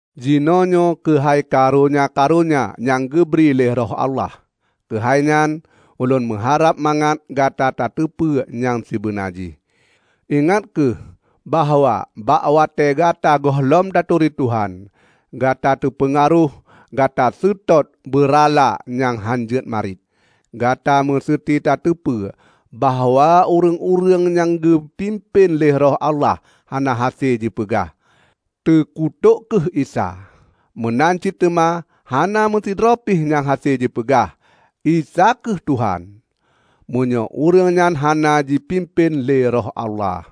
Jinoenyoe keuhai karonya-karonya nyang geubri lé Roh Allah. Keuhai nyan, ulôn meuharab mangat Gata tateupeue nyang sibeuna jih. Ingat kheueh bahwa bak watée gata gohlom taturi Tuhan, gata teupeungaroh gata seutôt beurala nyang hánjeuet mariet. Gata meuseuti tateupeue bahwa ureuëng-ureuëng nyang geupimpén lé Roh Allah hana hase jipeugah, "Teukutok kheueh Isa!" Meunan cit teuma hana meusidroe pih nyang hase jipeugah, "Isa kheueh Tuhan!" meunyoe ureuëng nyan hana jipimpén lé Roh Allah.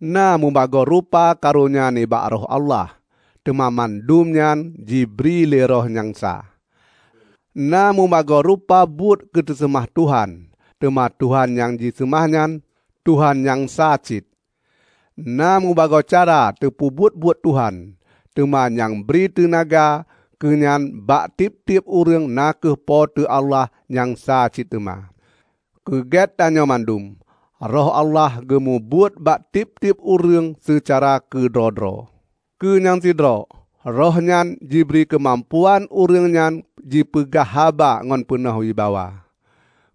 Na mubagoe rupa karonya nibak Roh Allah, teuma mandum nyan jibri lé Roh nyang sa. Na mubagoe rupa buet keu teuseumah Tuhan, teuma Tuhan nyang jiseumah nyan, Tuhan nyang sa cit! Na mubagoe cara teupeubuet buet Tuhan, teuma nyang bri teunaga keunyan bak tieb-tieb ureuëng na kheueh Po teu Allah nyang sa cit teuma. Keu keugét tanyoe mandum, Roh Allah geumubuet bak tieb-tieb ureuëng seucara keudroe-droe. Keu nyang sidroe, Roh nyan jibri keumampuan ureuëng nyan jipeugah haba ngon peunoh wibawa.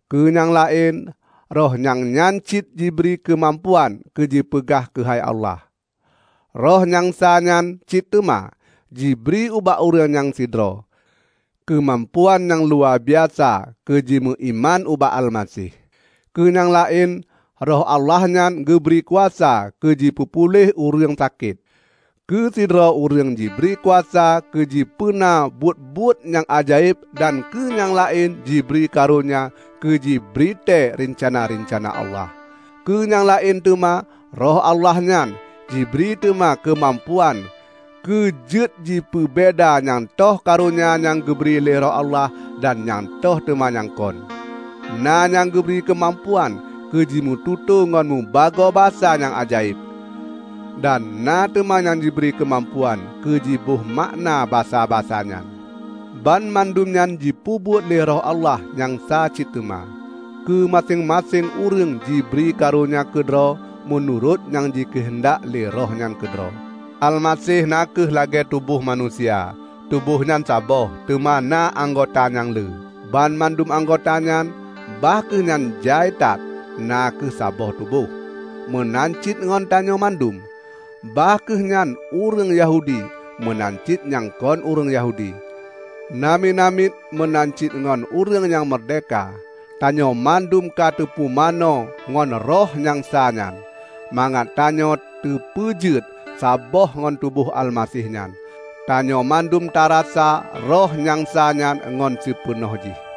Keu nyang laén Roh nyang nyan cit jibri keumampuan keu jipeugah keuhai Allah. Roh nyang sa nyan cit teuma jibri ubak ureuëng nyang sidroe, keumampuan nyang luwabiasa keue jimeuiman ubak Almaseh; keue nyang laén Roh Allah nyan geubri kuasa keu jipeupuléh ureuëng sakét. Keu sidroe ureuëng jibri kuasa keu jipeuna buet-buet nyang ajaéb dan keu nyang laén jibri karonya keu jibritée reuncana-reuncana Allah. Keu nyang laén teuma Roh Allah nyan jibri teuma keumampuan keujeuet jipeubeda nyang toh karonya nyang geubri lé Roh Allah dan nyang toh teuma nyang kon. Na nyang geubri keumampuan keu jimeututoe ngon mubagoe basa nyang ajaéb, dan na teuma nyang jibri keumampuan keu jibohmakna basa-basa nyan. Banmandum nyan jipeubuet lé Roh Allah nyang sa nyan cit teuma; keu maséng-maséng ureuëng jibri karonya keudroe meunurot nyang jikeuheundak lé Roh nyan keudroe. Almaseh na kheueh lagée tuboh manusia; tuboh nyan saboh, teuma na anggota nyang le. Banmandum anggota nyan, bah kheueh nyan jai that, na kheueh saboh tuboh. Meunan cit ngon tanyoe mandum, bah kheueh nyan ureuëng Yahudi meunan cit nyang kon ureuëng Yahudi, namiet-namiet meunan cit ngon ureuëng nyang meurdehka; tanyoe mandum kateupumanö ngon Roh nyang sa nyan, mangat tanyoe teupeujeuet saboh ngon tuboh Almaseh nyan. Tanyoe mandum tarasa Roh nyang sa nyan ngon sipeunoh jih.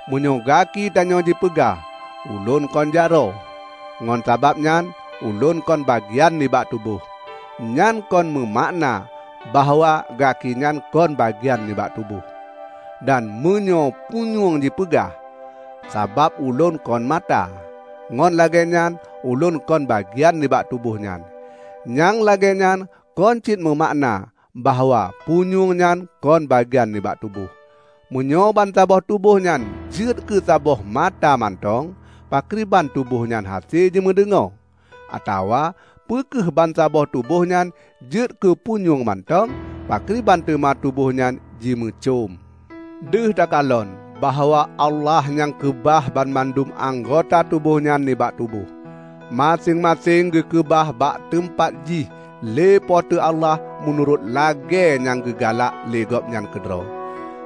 Meunyoe gaki tanyoe jipeugah, "Ulôn kon jaroe, ngon sabab nyan ulôn kon bagian nibak tuboh," nyan kon meumakna bahwa gaki nyan kon bagian nibak tuboh. Dan meunyoe punyueng jipeugah, "Sabab ulôn kon mata, ngon lagée nyan ulôn kon bagian nibak tuboh nyan," nyang lagée nyan kon cit meumakna bahwa punyueng nyan kon bagian nibak tuboh. Meunyoe bansaboh tuboh nyan jeuet keu saboh mata mantong, pakriban tuboh nyan hase jimeudeungoe? Atawa peu kheueh bansaboh tuboh nyan jeuet keu punyueng mantong, pakriban teuma tuboh nyan jimeucöm? Deuh takalon bahwa Allah nyang keubah banmandum anggota tuboh nyan nibak tuboh. Maséng-maséng geukeubah bak teumpat jih lé Po teu Allah meunurot lagée nyang geugalak lé Gobnyan keudroe.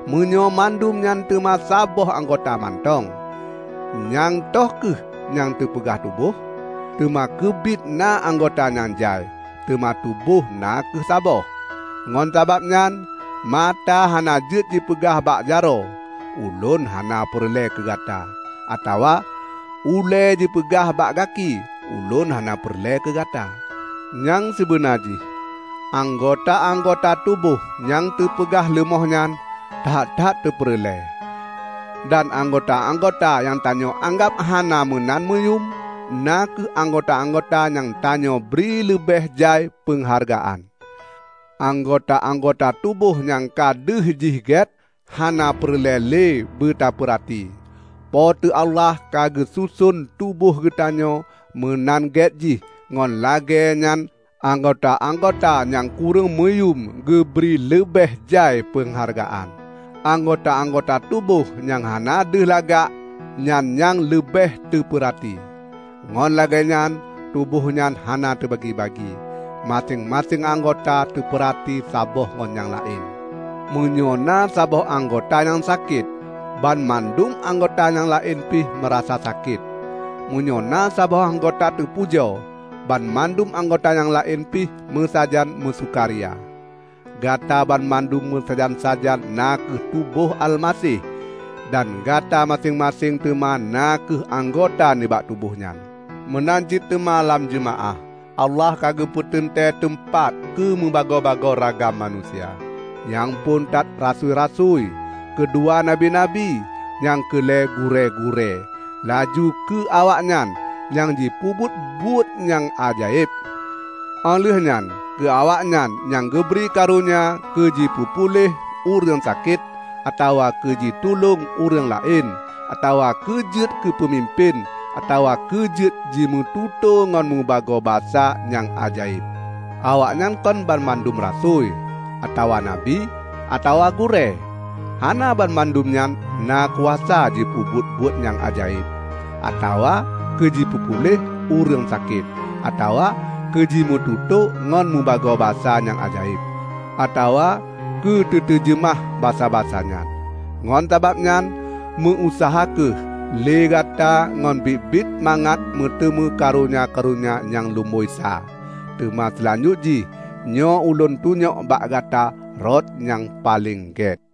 Meunyoe mandum nyan teuma saboh anggota mantong, nyang toh kheueh nyang teupeugah tuboh? Teuma keubiet na anggota nyang jai, teuma tuboh na kheueh saboh. Ngon sabab nyan, mata hana jeuet jipeugah bak jaroe, "Ulôn hana peureulée keugata!" atawa ulée jipeugah bak gaki, "Ulôn hana peureulée keugata!" Nyang sibeuna jih anggota-anggota tuboh nyang teupeugah leumoh nyan, that-that tapeureulée; dan anggota-anggota nyang tanyoe anggab hana meunan meuyum, na kheueh anggota-anggota nyang tanyoe bri leubeh jai peunghargaan. Anggota-anggota tuboh nyang ka deuh jih g`et, hana peureul`ee l`e beutapeurati. Po teu Allah ka geususon tuboh geutanyoe meunan g`et jih ngon lag`ee nyan anggota-anggota nyang kureueng muyuem geubri leub`eh jai peunghargaan. Anggota-anggota tuboh nyang hana deuh lagak, nyan nyang leubeh teupeurati. Ngon lagée nyan tuboh nyan hana teubagi-bagi; maséng-maséng anggota teupeurati saboh ngon nyang laén. Meunyoe na saboh anggota nyang sakét, banmandum anggota nyang laén pih meurasa sakét; meunyoe saboh anggota teupujoe, banmandum anggota nyang laén pih meusajan meusukaria. Gata banmandum meusajan-sajan na kheueh tuboh Almaseh dan gata maséng-maséng teuma na kheueh anggota nibak tuboh nyan. Meunan cit teuma lam jeumaáh, Allah ka geupeuteuntée teumpat keumubagoe-bagoe ragam manusia: Nyang phon that rasui-rasui; keudua, nabi-nabi, nyang keu lhée, gurée-gurée, laju keu awaknyan nyang jipeubuet buet-buet nyang ajaéb, óh lheueh nyan keu awaknyan nyang geubri karonya keu jipeupuléh ureuëng sakét, atawa keu jitulông ureuëng laén, atawa keu jeuet keupeumimpén, atawa keu jeuet jimeututoe ngon meubagoe basa nyang ajaéb. Awaknyan kon banmandum rasui, atawa nabi, atawa gurée. Hana banmandum nyan na kuasa jipeubuet buet nyang ajaéb, atawa keu teupeupuléh ureuëng sakét, atawa keumututoe ngon mubagoe basa nyang ajaéb, atawa keu teutejeumah basa-basa nyan. Ngon sabab nyan, meu-useuha kheueh lé gata ngon biet-biet mangat meuteumé karonya-karonya nyang lumboi sa. Teuma seulanjut jih nyoe ulôn tunyok bak gata rot nyang paleng gét.